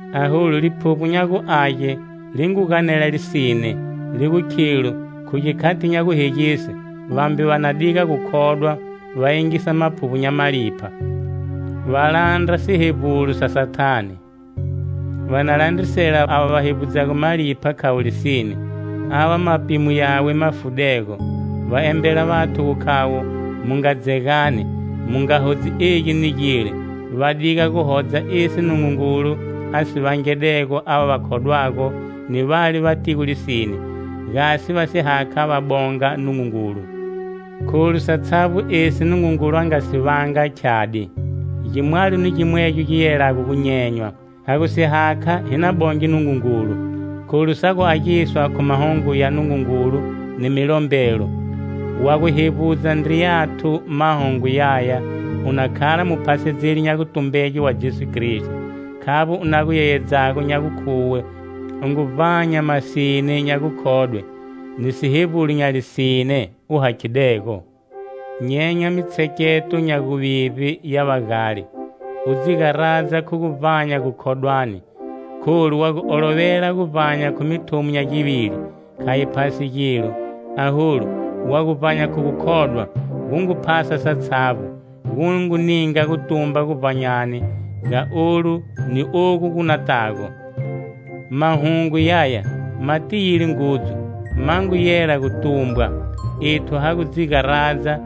Aholu Liphuvbo nya gu Age li ngu ganela lisine, li gu khilo khu gikhati nya guhegise vambe va na diga gukhodwa, va yingisa maphuvbo nya malipha, va landra sihevbulo sa Sathane. Va na landrisela ava va hevbudzago malipha khavo lisine, ava mapimo yawe ma fudego. Va embela vathu gu khavo mu nga dzegani, mu nga hodzi egi ni gile; va diga gu hodza esi Nungungulu a si vangedego ava va khodwago ni vale va tigo lisine, gasi va si hakha va bonga Nungungulu. Kholu satshavbo esi Nungungulu a nga si vanga khyadi, gimwalo ni gimwegyo gi yelago gu nyenywa. Ha gu si hakha, hi na bonge Nungungulu. Kholu sa gu agiswa khu mahungu ya Nungungulu ni milombelo. Wa gu hevbudza vandriyathu mahungu yaya u na khala muphasedzeli nya gutumbege wa Jesu Kristo. Khavbo u na gu yeyedzago nya gukhuwe u ngu vbanya masine nya gukhodwe, ni sihevbulo nya lisine u hakhidego. Nyenya mitsheketo nya guvivbe ya vagale, u dzi garadza khu gu vbanya gukhodwani. Kholu wa gu olovela guvbanya khu mithumo nya givili, kha yi phasi gilo, aholu, wa gu vbanya khu gukhodwa, gu ngu phasa satshavbo, gu ngu ninga gutumba guvbanyani ga olu ni ogu gu natago. Mahungu yaya ma tiyile ngudzu, ma ngu yela gu tumbwa. Ethu ha gu dzi garadza,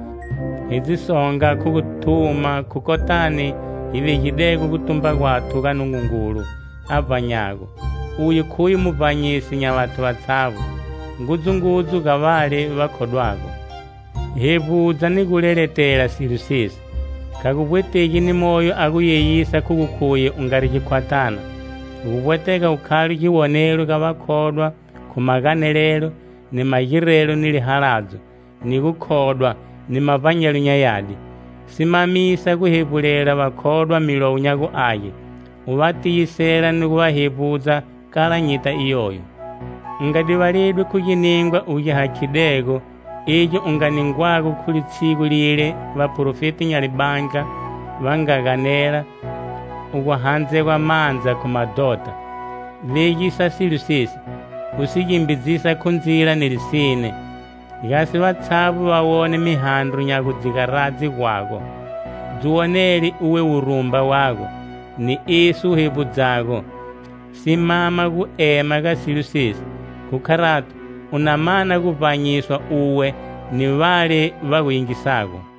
hi dzi songa khu gu thuma khu kotani hi vegidego gutumba gwathu ga Nungungulu a vbanyago. Uye khuye muvbanyisi nya vathu vatshavbo ngudzungudzu ga vale va khodwago. Hevbudza ni gu leletela silo sesi. Kha gu vbwetegi ni moyo a gu yeyisa khu gu khuye u ngari gikhwathana. Gu vbwetega u khale giwonelo ga vakhodwa khu maganelelo, ni magirelo ni lihaladzo, ni gukhodwa, ni mavbanyelo nya yadi. Simamisa gu hevbulela vakhodwa Milowo nya gu Age, u va tiyisela ni gu va hevbudza kala nyita iyoyo. U nga divaledwi khu giningwa u gi hakhidego, egi u nga ningwago khu litshigu lile vaprofeti nya libandla va nga ganela, u gu handzegwa mandza khu madhota. Vegisa silo sesi, u si gimbidzisa khu ndzila ni lisine, gasi vatshavbo va wone mihandro nya gu dzi garadze gwago. Dzi wonele uwe wurumba wago, ni esi u hevbudzago. Simama gu ema ga silo sesi. Khu kharato, u na mana guvbanyiswa uwe ni vale va gu yingisago.